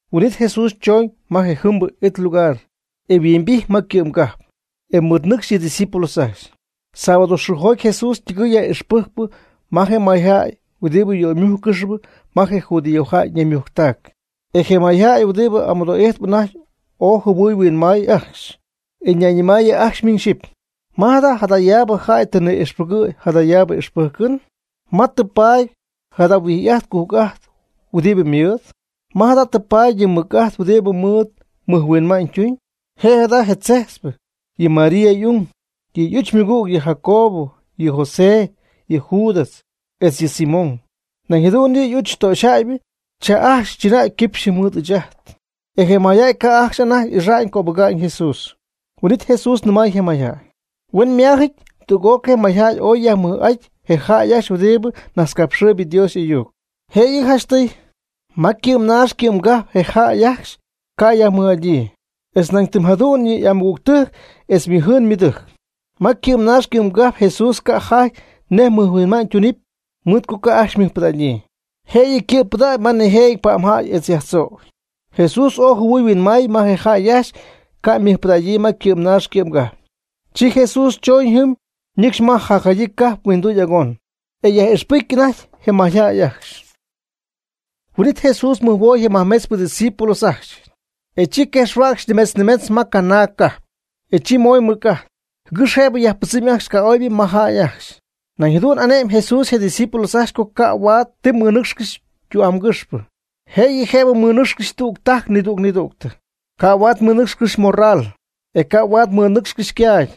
Huin'it Jesús chooñ ma je jɨmbɨ it lugar, e yhuimbijty ma ycɨ'mgajp. E mɨɨd ñɨcxy yɨ' ydiscípulos ajcxy. Sábado xɨɨjoty Jesús ytɨgɨy yaj'ixpɨjcp ma je mayjäy huɨdibɨ yöymújccɨxp ma je judío jäy ñaymujctac. E je mayjäy huɨdibɨ amɨdoo'ijtp anajty ooy jɨhuɨy huinmay ajcxy, e ñayñɨmaayɨ ajcxy miñ xyɨpy: ―¿Ma jada' jadayaab jäy tɨ ni'ixpɨgɨ̈y jadayaab ixpɨ́jcɨn? ¿Ma tɨ paady jada huijy'ajt cujc'ajt huɨdibɨ ymɨɨd? ¿Ma jada' tɨ paady yɨ mɨc'ajt huɨdibɨ mɨɨd mɨjhuima'ñ tumyb? Je' jada je tzejtzpɨ, yɨ María y'ung. Yɨ' y'uch ymɨgüg, yɨ Jacobo, yɨ José, yɨ Judas, etz yɨ Simón. Nañ jadu'n yɨ' y'uch töxyjäybɨ cha ajcxy chɨnäy quipxy mɨɨd ɨɨch ajt. E je mayjäy ca'ajcxy anajty ixa'ñ cöbɨga'ñ Jesús. Huin'it Jesús nɨmay je mayjäy ajcxy: ―Huenma'ámyɨty tüg'ócɨy je mayjäy ooy yajmɨj'aty je jäy ajcxy huɨdibɨ najtzcapxɨɨyb Dios y'ayuc. Jëyɨ janchtɨy, ma ycɨ'm naax ma ycɨ'mgajp ca' je jäy ajcxy yajmɨj'adyii, etz nañ ytɨm jadu'n yɨ' y'amɨgügtɨjc etz ymɨjɨɨn ymɨdɨjc. Ma ycɨ'm naax ycɨ'm gajp Jesús ca' jaty nej mɨjhuinma'ñ tunɨpy mɨɨd co ca' ajcxy mɨjpɨdägyii. Jëyɨ ycɨ̈pɨdacy ma nijëjɨty pa'mjäy etz yajtzoocy. Jesús ooy jɨhuɨy huinmay nej je jäy ajcxy ca' ymɨjpɨdägyii ma ycɨ'm naax ycɨ'm gajp. Chi Jesús chooñ jɨm ñɨcxy ma jacjadyii cajp huinduy agonbɨ, e yaj'ixpɨjcy anajty je mayjäy ajcxy. Huin'it Jesús mɨjhuoy je majmetz ydiscípulos ajcxy, e chi quejxhuäcxy nimetz nimetz ma canaag cajp. E chi mooy mɨc'ajt, jɨgɨx jëb yajpɨdzɨmy ajcxy ca'oybɨ ma jäy ajcxy. Nañ jadu'n y'ane'my Jesús je' ydiscípulos ajcxy co ca' huaad ti mɨnɨ́cxcɨxy tü'amgɨxpɨ, jëyɨ jëb mɨnɨ́cxcɨxy tüg tajc nidüg nidügtɨ. Ca' huaad mɨnɨ́cxcɨxy ymorral, e ca' huaad mɨnɨ́cxcɨxy ycaagy,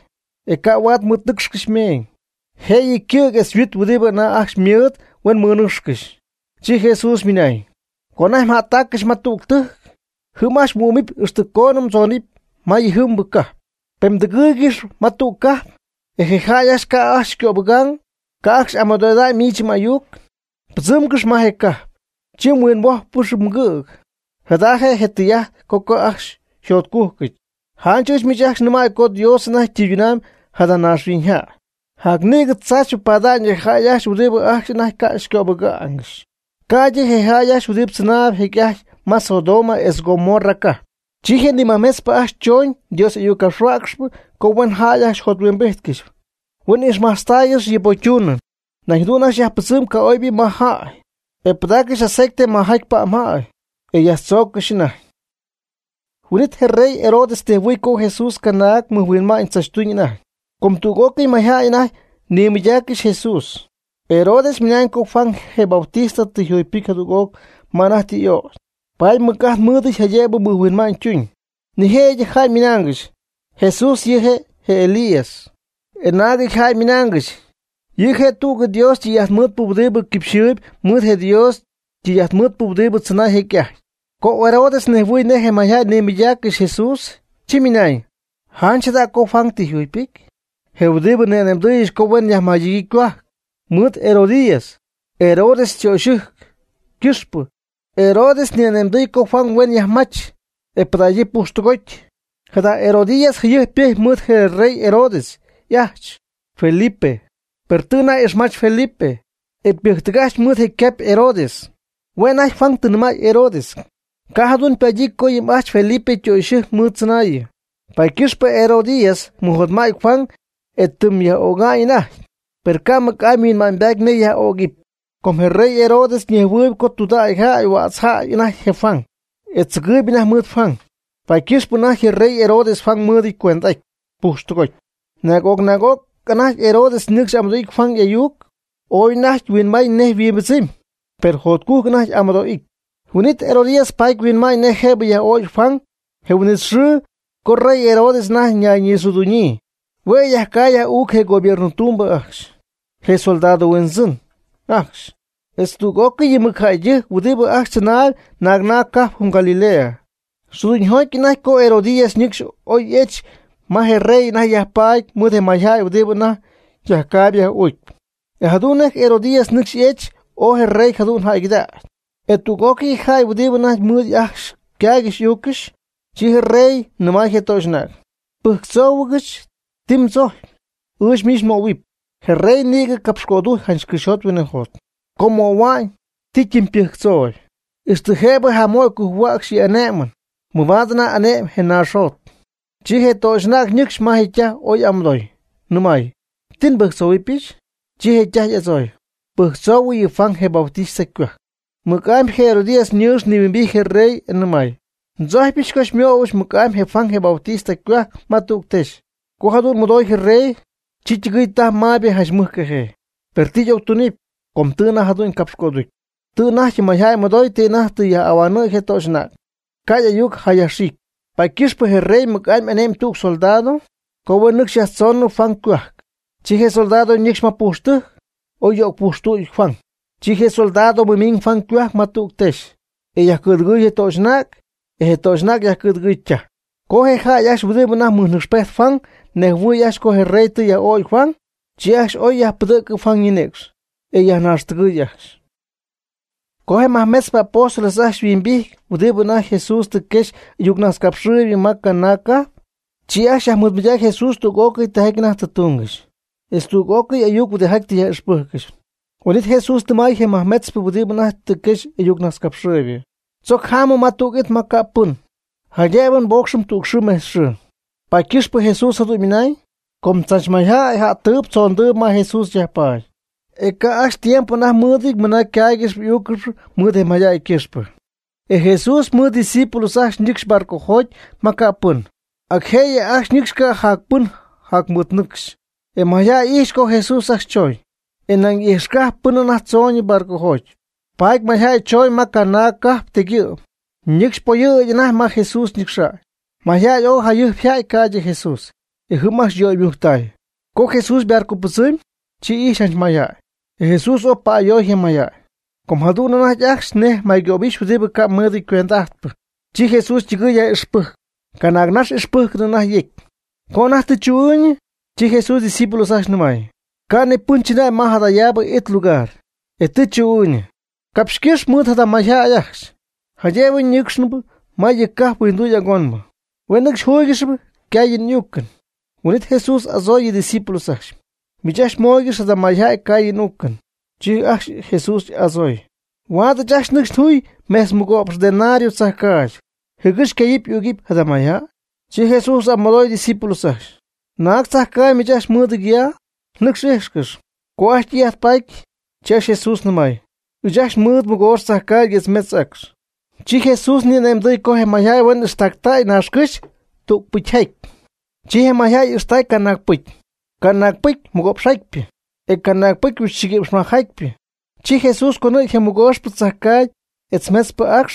e ca' huaad mɨnɨcxcɨxy ymeeñ. Jëyɨ je ycɨ̈g etz je yhuit huɨdibɨ anajty ajcxy ymɨɨd huen mɨnɨcxcɨxy. Chi Jesús ymɨnañ: ―Co anajty ajcxy mjättaccɨxy ma tüg tɨjc, jɨm ajcxy mhuɨ́'mɨpy ixtɨ coon mdzóonɨp ma yɨjɨmbɨ cajp. Pen mdɨgɨɨygɨxp ma tüg cajp, e je jäy ajcxy ca' ajcxy xycöbɨga'ñ, ca' ajcxy amɨdo'ida'ñ miich m'ayuc, mbɨdzɨmgɨx ma je cajp, chi mhuinhuójpcɨxɨpy mgïg. Jada je' je tɨy'ajt co ca' ajcxy mjotcújcɨty. Janch ɨɨch miich ajcxy nɨmäy co Dios anajty ytɨyduñ jada naaxhuiñ jäy, jacnïgɨ tzaachypɨ paada'ñ yɨ jäy ajcxy huɨdibɨ ajcxy anajty ca' xycöbɨ́jccɨxy, ca'ydɨ je' ajcxy huɨdibɨ tzɨnaay jecy'aty ma Sodoma etz Gomorra cajp. Chi je nimajmetzpɨ ajcxy chon Dios y'ayuccapxhuäcxy co huen jäy ajcxy jothuimbíjtcɨxy, huen ixmajtztaaygɨxy yɨ pocytunɨɨ. Nañ jadu'n ajcxy yajpɨdzɨmy ca'oybɨ majaty jäy, e pɨdaaccɨxy aceite majaty pa'mjäy, e yajtzóoccɨxy anajty. Huin'it je rey Herodes nejhuɨɨy co Jesús canaag mɨjhuinma'ñ tzachytuñ anajty, com tüg'ócɨy je mayjäy anajty nimɨydaaccɨxy Jesús. Herodes ymɨnañ co Juan je Bautista tɨ yjugypɨcy jadüg'oc ma anajty tɨ y'ögy, paady mɨc'ajt mɨɨdɨty jaydëb mɨjhuinma'ñ tuñ. Nijëjɨty jäy ymɨnaangɨxy: ―Jesús yɨ' je' Elías. E naagɨty jäy ymɨnángɨxy: ―Yɨ' je' tüg Dios tɨy'ajtmɨɨdpɨ huɨdibɨ quipxyɨɨby mɨɨd je Dios ytɨy'ajtmɨɨdpɨ huɨdibɨ tzɨnay jecy'ajty. Co Herodes nejhuɨɨy nej je mayjäy nimɨydaaccɨxy Jesús, chi ymɨnañ: ―Janch jada co Juan tɨ yjugypɨcy, je huɨdibɨ nni'ane'mdɨɨyɨch co huen yajmɨnagyii ycohuajc. Mɨɨd Herodías, Herodes ytöxytɨjc ycɨxpɨ, Herodes n'ane'mdɨɨy co Juan yajmach, e pɨdägyii pujxtɨgoty. Jada Herodías jayɨjp ypɨjcy mɨɨd je rey Herodes y'ajch Felipe, per tɨ anajty ixmach Felipe, e ypɨjctɨgajch mɨɨd je ycapy Herodes. Hue' anajty Juan tɨ nɨmay Herodes: ―Ca' jadu'n paadyii co yɨ m'ajch Felipe ytöxytɨjc miich mɨɨddzɨnaayɨ. Paady ycɨxpɨ Herodías mɨjotma'ty Juan, e ytɨmy yaj'ögamy anajty. Per ca' mɨc'amy yhuinma'ñybaty nej ocyaj'ögɨp; com je rey Herodes ñejhuɨɨyb co tudägy jäy huädz jäy anajty je Juan, e tzɨgɨɨyb anajty mɨɨd Juan. Paady ycɨxpɨ anajty je rey Herodes Juan mɨɨdɨty cuend'aty pujxtɨgoty. Naag'oc naag'oc anajty Herodes nɨcxy amɨdo'ity Juan y'ayuc, ooy anajty huinmay nej yhuimbɨdzɨmy, per jotcujc anajty amɨdo'ijty. Huin'it Herodías ypat huinma'ñ nej jëb yaj'ögy Juan je huin'it xɨɨ co je rey Herodes anajty ñayñixɨɨduñyii. Hue' yajcay yaj'uucy je gobierno ytumbɨ ajcxy, je soldado huindzɨn ajcxy, etz tüg'ócɨy yɨ mɨc jäydɨjc huɨdibɨ ajcxy tzɨnaayb naag naag cajp jɨm Galilea. Xɨɨduñyjoty anajty co Herodías ñɨɨx oy y'ech ma je rey anajty yajpaady mɨɨd je may jäy huɨdibɨ anajty yajcaayb yaj'uucpy. E jadu'n nej je Herodías ñɨɨx y'ejch, ooy je rey jadu'n jäygɨdacy, etz tüg'ócɨy je jäy je huɨdijaty anajty mɨɨd ajcxy ycaaygɨxy y'uuccɨxy. Chi je rey nɨmay je töxy'anäg: ―Pɨjctzóohuɨgɨch ti mdɨmdzojcpy, ɨɨch miich nmöhuɨpy. Je rey nïgɨ capxcödujcy janch cɨxyjot huinɨjot co möhua'ñ ti ytimy ypɨjctzooyb, ixtɨ jëb jamöy cujhuäcxy yɨ' y'ané'mɨn, mɨbaad anajty ane'my je naaxjot. Chi je töxy'anäg ñɨcxy ma ytaj oy amɨdoy, nɨmay: ―¿Ti nbɨjctzohuɨ́pɨch? Chi je' ytaj y'adzooy: ―Pɨjctzoohuɨ yɨ Juan je Bautista ycohuajc. Mɨc'amy je Herodías ñɨɨx nihuimbity je rey e ymɨnañ: ―Ndzojcypɨch co xymöhuɨbɨch mɨc'amy je Juan je Bautista ycohuajc ma tüg texy. Co jadu'n mɨdoy je rey, chi ytɨgɨɨy tajp mayb janch mɨjcajee. Per ti y'octunɨpy. Com tɨ anajty jadu'n capxcöducy, tɨ anajty mayjäy mɨdoy ti anajty tɨ yaj'ahuanɨ̈y je töxy'anäg, ca' y'ayuc yajxiicy. Paady ycɨxpɨ je rey mɨc'amy ane'my tüg soldado, co huen nɨcxy yajtzonɨ Juan ycohuajc. Chi je soldado ñɨcxy ma pujxtɨjc, e yöcpujxtuuty Juan. Chi je soldado mɨmiiñ Juan ycohuajc ma tüg texy, e yajcɨ̈dɨgɨy je töxy'anäg, e je töxy'anäg yajcɨ̈dɨgɨy ytaj. Co je jäy ajcxy huɨdibɨ anajty mɨjnɨcxpejtp Juan ñejhuɨɨy ajcxy co je rey tɨ yaj'ögy Juan, chi ajcxy y'oy e yajpɨdɨ̈cɨ Juan ñinïcx, e yajnaaxtɨgɨɨy ajcxy. Co je majmetzpɨ apóstoles ajcxy yhuimbijty huɨdibɨ anajty Jesús tɨ quexy y'ayuccapxhuäcxpɨ ma canaag cajp, chi ajcxy yajmɨɨdmɨydacy Jesús tüg'ócɨy tijaty anajty tɨ túngɨxy, etz tüg'ócɨy ayuc huɨdijaty tɨ yaj'ixpɨ́jccɨxy. Huin'it Jesús nɨmay je nimajmetzpɨ huɨdibɨ anajty tɨ quexy y'ayuccapxhuäcxpɨ: ―Tzoc jámɨm ma tüg it ma ca' pɨn, jaydëb nbócxɨm tüg xɨɨ metz xɨɨ. Paady ycɨxpɨ Jesús jadu'n ymɨnañ, com tzach mayjäy ja'ttɨɨb tzondɨɨb ma Jesús yajpaady, e ca' ajcxy tiempo anajty mɨ́ɨdɨty mɨna ycáaygɨxɨpy y'úuccɨxɨpy mɨɨd je mayjäy ycɨxpɨ. E Jesús mɨɨd ydiscípulos ajcxy ñɨcxy barcojoty ma ca' pɨn. Ac jëyɨ ajcxy nɨcxy ca' jac pɨn jäy mɨɨd nɨcxy. E mayjäy ijxy co Jesús ajcxy choñ, e nañ ijxcajpy pɨn anajty tzoñ barcojoty. Paady mayjäy chooñ ma canaag cajp tegyɨ'm, ñɨ́cxcɨxy poyɨ̈gy anajty ma Jesús ñɨcxa'ñ. Mayjäy oy yja'ty jayɨjp ca'ydɨ Jesús ajcxy, e jɨm ajcxy yöymujctay. Co Jesús ybarcopɨdzɨmy, chi ixy janch mayjäy, e Jesús ooy pa'ayoy je mayjäy, com jadu'n anajty ajcxy nej maycöbixy huɨdibɨ ca' mɨɨdɨty ycuend'ajtpɨ. Chi Jesús ytɨgɨy yaj'ixpɨjcp, canaag nax ixpɨ́jcɨn anajty yecy. Co anajty tɨ chu'ɨɨyñɨ, chi Jesús ydiscípulos ajcxy ñɨmaayɨ: ―Ca' ni pɨn chɨnäy ma jadayaabɨ it lugar, e tɨ chu'ɨɨyñɨ. Capxycɨ́x mɨɨd jada mayjäy ajcxy, jaydëb ñɨ́cxcɨxyñɨ ma yɨ cajp huinduy agonbɨ, huen nɨcxy júygɨxɨpy ycaayɨn y'uucɨn. Huin'it Jesús y'adzooy yɨ' ydiscipulos ajcxy: ―Miich ajcxy móoygɨx jada mayjäy caayɨn úucɨn. Chi ajcxy Jesús y'adzooy: ―¿Huaad ɨɨch ajcxy nɨcxy njuy mejtz mɨgo'px denario tzajcaagy, jɨgɨx ycayɨpy y'ügɨpy jada mayjäy? Chi Jesús y'amɨdooy ydiscípulos ajcxy: ―¿Naag tzajcaagy miich ajcxy mɨɨdɨty ya? Nɨcx íjxcɨx. Co ajcxy tɨy'ajt paty, chi ajcxy Jesús nɨmay: ―Ɨɨch ajcxy nmɨɨd mɨgoox tzajcaagy etz metz acx. Chi Jesús ni'ane'mdɨɨy co je mayjäy huen ixtaaccɨxy naaxcɨ́xy tügpɨcyjaty. Chi je mayjäy y'ixtactay canaagpɨcy. Canaagpɨcy mɨgo'px jatypɨ, e canaagpɨcy huixchiguïpxmajcjatypɨ. Chi Jesús conɨ̈gy je mɨgooxpɨ tzajcaagy etz je metzpɨ acx,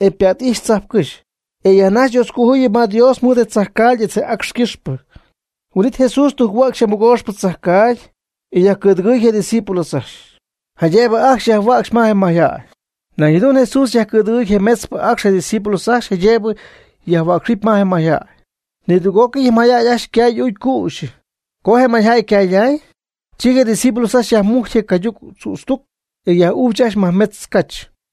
e ypa't'ijxy tzajpcɨ́xy, e yajnajxy Dios cojuyɨp ma Dios mɨɨd je tzajcaagy etz je acx ycɨxpɨ. Huin'it Jesús tujc-huäcxy je mɨgooxpɨ tzajcaagy, e yajcɨ̈dɨgɨy je' ydiscípulos ajcxy, jaydëb ajcxy yajhuäcxɨp ma je mayjäy. Nañ jadu'n Jesús yajcɨ̈dɨgɨɨy je metzpɨ acx je' ydiscípulos ajcxy, jaydëb yajhuäcxɨp ma je mayjäy. Nidüg'ócɨy je mayjäy ajcxy ycay y'uucy cüxyɨ. Co je mayjäy ycayday, chi je discípulos ajcxy yajmujcy je cayduc tzütztuc, e yaj'ujch ajcxy majmetz cach.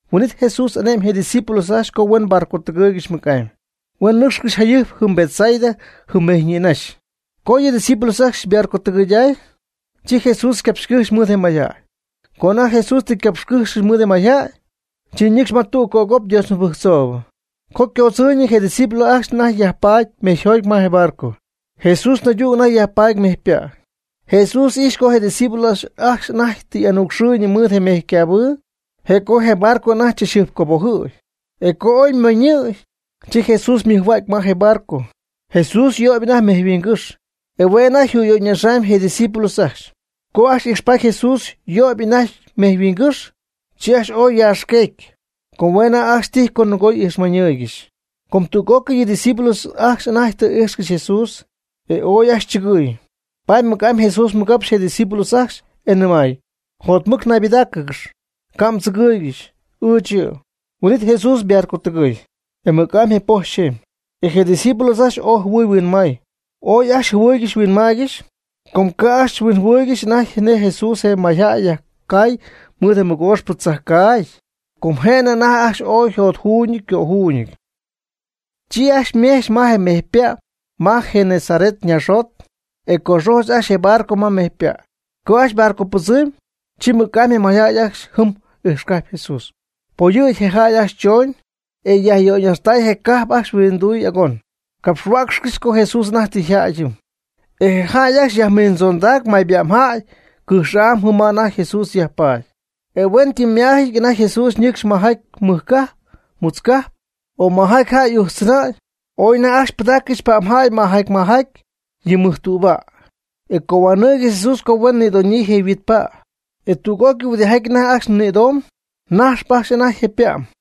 Huin'it Jesús ane'my je' ydiscípulos ajcxy co huen barcotɨgɨɨygɨxy mɨc'amy. Huen nɨcxɨ̈ccɨxy jayɨjp jɨm Betsaida jɨm mejy ñïnajxy. Co yɨ discípulos ajcxy ybarcotɨgɨyday, chi Jesús ycapxycɨ́jxy mɨɨd je mayjäy. Co anajty Jesús tɨ ycapxycɨ́xy mɨɨd je mayjäy, chi ñɨcxy ma tüg cögop Dios mɨbɨjctzoob. Co ycoodzɨɨyñɨ je discípulos ajcxy anajty yajpaady mejyjoty ma je barco. Jesús naydüg anajty yajpaady mejypa'. Jesús y'ijx co je'ydiscípulos ajcxy anajty tɨ y'anucxɨɨygɨxy mɨɨd mejycabɨɨ, je' co je barco anajty chachjɨjpcobojɨ̈y. E co oy moñɨ̈y, chi Jesús ymɨjhuägy ma je barco. Jesús yöyp anajty mejyhuingɨ́xy, e hue' anajty jüyöyñaxamy je discípulos ajcxy. Co ajcxy ijxpaty Jesús yöyp anajty mejyhuingɨ́xy, chi ajcxy ooy yaxqueegy, com hue' anajty ajcxy tijy co nɨgo y'ijxmañɨɨygɨxy. Com tüg'ócɨy yɨ discípulos ajcxy anajty tɨ íjxcɨxy Jesús, e ooy ajcxy chɨgɨɨy, paady mɨc'amy Jesús mɨgapxy je' ydiscípulos ajcxy, e nɨmay: ―Jotmɨc naybɨdáacɨgɨxy, ca' mdzɨgɨɨygɨxy. Ɨɨch yɨ'. Huin'it Jesús ybarcotɨgɨɨy, e mɨc'amy je poj yxeemy, e je discípulos ajcxy ooy jɨhuɨy huinmay. Ooy ajcxy jɨhuɨɨygɨxy huinmaaygɨxy, com ca' ajcxy huinjɨhuɨɨygɨxy anajty nej Jesús je mayjäy yajcay mɨɨd je mɨgooxpɨ tzajcaagy. Com je'nɨ anajty ajcxy ooy yjotjuuñɨty ycöjuuñɨty. Chi ajcxy ymejch ma je mejypa' ma je Genesaret ñaaxjot. E coxojch ajcxy je barco ma mejypa'. Co ajcxy ybarcopɨdzɨmy, chi mɨc'amy je mayjäy ajcxy jɨm ijxcajpy Jesús. Poyɨ̈gy je jäy ajcxy chooñ, e yajyöyñajxtay je cajp ajcxy huinduy agonbɨ, capxhuäcxcɨxy co Jesús anajty tɨ yjädy jɨm. E jäy ajcxy yajmiindzondacy may pa'mjäy cɨjx'am jɨm ma anajty Jesús yajpaady. E hueñytɨm ma'amyɨty anajty Jesús ñɨcxy majaty mɨj cajp, mutz cajp, o majaty jäy y'ujtztzɨnäy, ooy anajty ajcxy pɨdáccɨxy pa'mjäy majaty majaty yɨ mɨj tüba', e cohuanɨɨygɨxy Jesús co huen nïdoñyii yɨ yhuitpa', e tüg'ócɨy huɨdijaty anajty ajcxy nïdomb, najxp ajcxy anajty je' ypa'm.